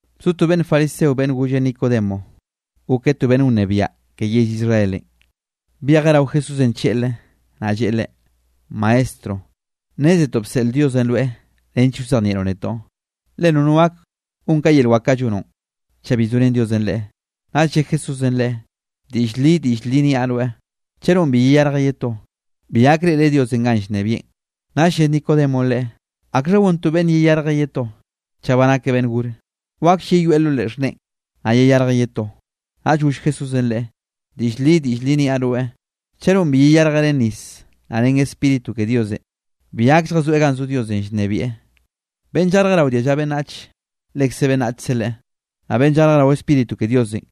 Bzo to beꞌnn fariseo beꞌnn golle Nicodemo. Gokeꞌ to beꞌnne wnebiaꞌ ke yell Israelenꞌ. Byejeꞌ rao Jesúsenꞌ tlleꞌlre, naꞌ lleꞌe Leꞌe: —Maestro, nnézetoꞌ bseꞌl Diosenꞌ rweꞌ nench wzejnieꞌroꞌ netoꞌ, le nono gak gon ka yel wak kaꞌ llonoꞌn, chaꞌ bi zorén Diosenꞌ leꞌe. Naꞌll lle Jesúsenꞌ leꞌe: —Diꞌll li, diꞌll li niaꞌ rweꞌ, chaꞌ nonꞌ bi yeyarjeꞌ ye to, bi gak reꞌreꞌ Diosenꞌ ganꞌ llnebieꞌn. Naꞌll lle Nicodemonꞌ leꞌe: —¿Akxha gon to beꞌnne yeyarjeꞌ ye to, chaꞌ ba nakeꞌ beꞌnn gore? ¿Waklle yeyoeꞌ lo leꞌe xhneꞌen, naꞌ yeyarjeꞌ ye to? Naꞌll goll Jesúsenꞌ leꞌe: —Diꞌll li, diꞌll li niaꞌ rweꞌ, chaꞌ nonꞌ bi yeyarjeꞌ ren nis, naꞌ ren Spíritu ke Diosenꞌ, bi gak lljazoeꞌ ganꞌ zo Diosenꞌ llnebieꞌ. Beꞌnn llarjeꞌ rao dialla beꞌnnach, lekze beꞌnnachkze leꞌe. Naꞌ beꞌnn llarjeꞌ rao Spíritu ke Diosenꞌ,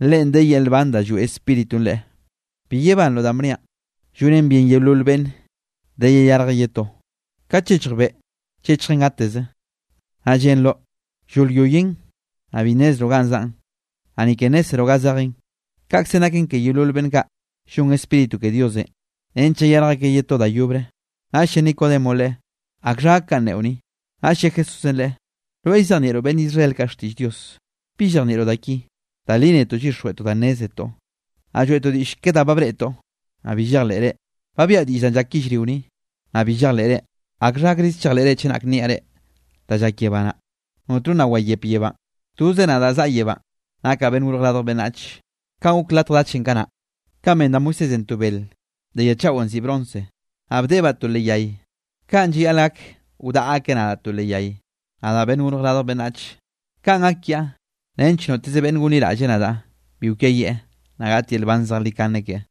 leꞌen de yel nban danꞌ lloeꞌ Spíritunꞌ leꞌe. Bi yebanroꞌ danꞌ bniaꞌ: “Llonen bien yeolol beꞌnne de yeyarjeꞌ ye to.” Kat llechj beꞌ, llechjen gateze, naꞌ llenroꞌ llolyoyen, naꞌ bi nnezroꞌ ga zaꞌn, naꞌ ni ke nnézzeroꞌ ga zejen. Kaꞌkzenꞌ naken ke yeolol beꞌnn kaꞌ llon Spíritu ke Diosenꞌ nench llayarj akeꞌ ye to da yobre. Naꞌll lle Nicodemonꞌ Leꞌe: —¿Akxha gak kanꞌ neꞌo ni? Naꞌll lle Jesúsenꞌ leꞌe: —Rweꞌ llzejnieꞌroꞌ beꞌnn Israel kaꞌ xtiꞌll Dios, ¿bi llejnieꞌroꞌ da ki? Da li netoꞌ llyixjweꞌtoꞌ da nnézetoꞌ, naꞌ lloeꞌtoꞌ diꞌll ke da ba breꞌtoꞌ, naꞌ bi llejleꞌre. Ba biaꞌa diꞌll danꞌ llak yellrio ni, naꞌ bi llejleꞌre. ¿Akxha gakrize chejleꞌre chenak niaꞌ reꞌ danꞌ llak yebá naꞌ? ’Notno nna wayep yebánꞌ, toze nadaꞌ zaꞌa yebánꞌ nakaꞌ Beꞌnn Gorj Radj Beꞌnnach. Kanꞌ gok latj dachenꞌ kanaꞌ, kanꞌ ben da Moisésenꞌ to bel de ya chaꞌon nziꞌi bronce, naꞌ bdeꞌebaꞌ to leꞌ yay, kaꞌn llayaꞌl gak wdaꞌa akeꞌ nadaꞌ to leꞌ yay, nadaꞌ Beꞌnn Gorj Radj Beꞌnnach. Kaꞌn gak kiaꞌ nench noteze beꞌnn gonliraꞌlle nadaꞌ bi kwiayieꞌ, naꞌ gaꞌt yel nban zejlikane keꞌe.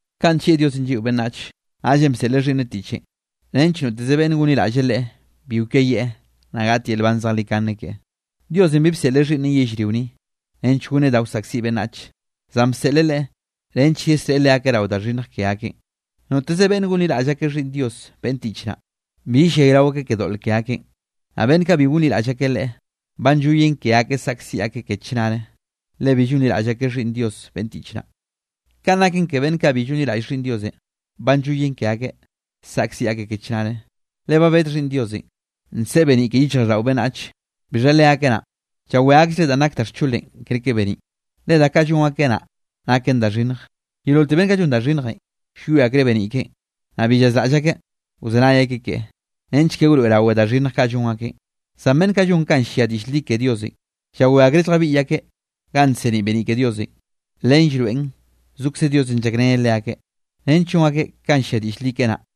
’Kaꞌn nllieꞌ Diosenꞌ lliꞌo beꞌnnach, naꞌllenꞌ bseꞌleꞌ Xhiꞌnneꞌ tiꞌchenꞌ nench noteze beꞌnne gonliraꞌlle Leꞌe bi kwiayieꞌ, naꞌ gaꞌt yel nban zejlikane keꞌe. Diosenꞌ bi bseꞌleꞌ Xhiꞌnneꞌn yellrio ni, nench goneꞌ da wsaꞌkziꞌ beꞌnnach, zan bseꞌleꞌ Leꞌe nench yesreꞌe leakeꞌ rao da xhinnj ke akeꞌn. ’Noteze beꞌnne gonliraꞌll akeꞌ Xhiꞌnn Dios beꞌnn tiꞌch naꞌ, bi yellayrao akeꞌ ke doꞌl ke akeꞌn, naꞌ beꞌnn kaꞌ bi gonliraꞌll akeꞌ Leꞌe, ba nlloyen ke akeꞌ saꞌkziꞌ akeꞌ ke chnare, le bi llonliraꞌll akeꞌ Xhiꞌnn Dios beꞌnn tiꞌch naꞌ. Kanꞌ naken, ke beꞌnn kaꞌ bi llonliraꞌll Xhiꞌnn Diosenꞌ, ba nlloyen ke akeꞌ, saꞌkziꞌ akeꞌ ke chnare, le ba bed Xhiꞌnn Diosenꞌ, nseꞌe beniꞌ ke yichjraꞌlldaꞌo beꞌnnach, bixha leakeꞌ naꞌn, llawé akllereꞌ danꞌ nak da xcholenꞌ kerke beniꞌn, le da kaꞌ llon akeꞌ naꞌ, naken da xhinnj. Yeololte beꞌnn kaꞌ llon da xhinnjenꞌ, llwie akreꞌ beniꞌ keꞌen, naꞌ bi llazraꞌll akeꞌ wzenay akeꞌ keꞌe, nench ke wroeꞌrawe da xhinnj kaꞌ llon akeꞌn. Zan beꞌnn kaꞌ llon kanꞌ llia diꞌll li ke Diosenꞌ, llawé akreꞌ lljabiꞌy akeꞌ ganꞌ nseniꞌ beniꞌ ke Diosenꞌ, len llroeꞌn zokze Diosenꞌ llakreneꞌ leakeꞌ, nench llon akeꞌ kanꞌ llia diꞌll li keꞌe naꞌ.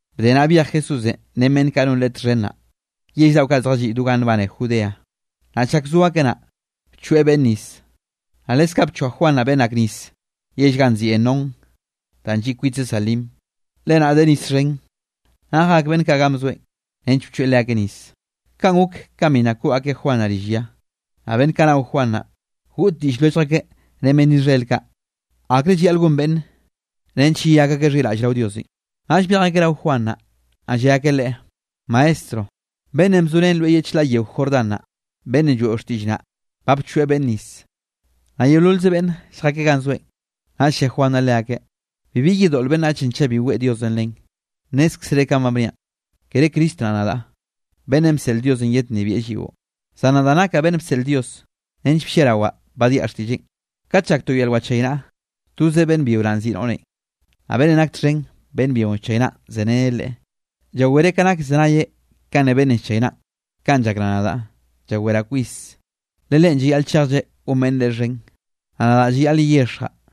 Bde naꞌ byej Jesúsenꞌ ren beꞌnn kaꞌ non Leꞌe txhen naꞌ, yell daꞌo kaꞌ zjalliꞌ do ganꞌ nbane Judeanꞌ, naꞌ chak zo akeꞌ naꞌ, bchoeꞌ beꞌnne nis. Naꞌ leskaꞌ bchoa Juan naꞌ beꞌnn ak nis yell ganꞌ nziꞌi Enón danꞌ lliꞌ kwitze Salim, le naꞌ de nis xhen, naꞌ jak beꞌnn kaꞌ ganꞌ bzoeꞌn nench bchoeꞌ leakeꞌ nis. Kaꞌn gok ka bi nna koꞌ akeꞌ Juan naꞌ rill ya. Naꞌ beꞌnn kaꞌ nao Juan naꞌ, goꞌd diꞌll lwellj akeꞌ ren beꞌnn Israel kaꞌ, akrenꞌ llayaꞌl gon beꞌnne nench yeyak akeꞌ xhiraꞌll rao Diosenꞌ. Naꞌll byej akeꞌ rao Juan naꞌ, naꞌ lle akeꞌ leꞌe: —Maestro, beꞌnnenꞌ bzo ren rweꞌ ye chlaꞌ yeo Jordán naꞌ, beꞌnnenꞌ lloeꞌo xtiꞌll naꞌ, ba llchoeꞌ beꞌnne nis, naꞌ yeololze beꞌnne lljakeꞌ ganꞌ zoeꞌn. Naꞌll lle Juan naꞌ leakeꞌ: —Bibi yedoꞌl beꞌnnachenꞌ chaꞌ bi weꞌe Diosenꞌ len. Nnézkzere kanꞌ ba bniaꞌn, kere Cristo naꞌ, nadaꞌ, beꞌnnenꞌ bseꞌl Diosenꞌ yednnebieꞌ lliꞌo. Zan nadaꞌ nakaꞌ beꞌnn bseꞌl Dios nench blliarawaꞌ badiaꞌ xtiꞌlleꞌn. Kat llak to yel wachaynaꞌa, toze beꞌnn byio naꞌ ziꞌi noꞌrenꞌ. Naꞌ beꞌnnenꞌ nak txhen beꞌnn byionꞌ llchaynaꞌn zereneꞌ leꞌe, llawereꞌ ka nak llzenayeꞌ kanꞌ ne beꞌnnenꞌ llchaynaꞌn. Kanꞌ llakraꞌ nadaꞌ, llaweraꞌ kwis. Le Leꞌen llayaꞌl chejlleꞌ gon beꞌnne Leꞌe xhen, naꞌ nadaꞌ llayaꞌl yeyexjaꞌ.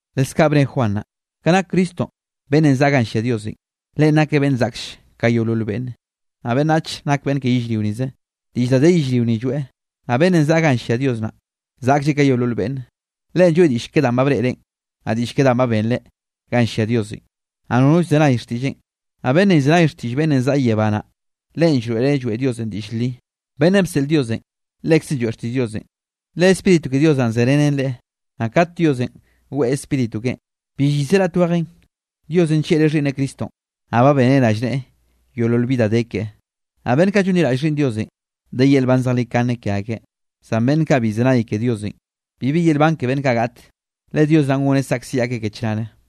Leskaꞌ bne Juan naꞌ: —Ka nak Cristonꞌ beꞌnnenꞌ zaꞌa ganꞌ llia Diosenꞌ, Leꞌen nakeꞌ beꞌnn zaklle ka yeolol beꞌnne. Naꞌ beꞌnnach nak beꞌnn ke yellrio nize, diꞌll da de yellrio ni lloeꞌ. Naꞌ beꞌnnenꞌ zaꞌa ganꞌ llia Dios naꞌ, zaꞌklleꞌ ka yeolol beꞌnne. Leꞌen lloeꞌ diꞌll ke danꞌ ba breꞌreꞌn, naꞌ diꞌll ke danꞌ ba benreꞌ ganꞌ llia Diosenꞌ, naꞌ nono llzenay xtiꞌlleꞌn. Naꞌ beꞌnnenꞌ llzenay xtiꞌll beꞌnnenꞌ zaꞌa yebá naꞌ, leꞌen llroeꞌreꞌ lloeꞌ Diosenꞌ diꞌll li. Beꞌnnenꞌ bseꞌl Diosenꞌ, lekzeꞌn lloeꞌ xtiꞌll Diosenꞌ, le Spíritu ke Dios naꞌ zerenen Leꞌe, naꞌ kat Diosenꞌ weꞌe Spíritu keꞌen, bi llyiseꞌ raꞌt wejen. Diosenꞌ nllieꞌreꞌ Xhiꞌnneꞌ Cristonꞌ, naꞌ ba beneꞌ rallneꞌe yeolol bi da de keꞌe. Naꞌ beꞌnn kaꞌ llonliraꞌll Xhiꞌnn Diosenꞌ, de yel nban zejlikane ke akeꞌ, zan beꞌnn kaꞌ bi llzenay ke Diosenꞌ, bibi yel nban ke beꞌnn kaꞌ gaꞌte, le Dios naꞌ goneꞌ saꞌkziꞌ akeꞌ ke chnare.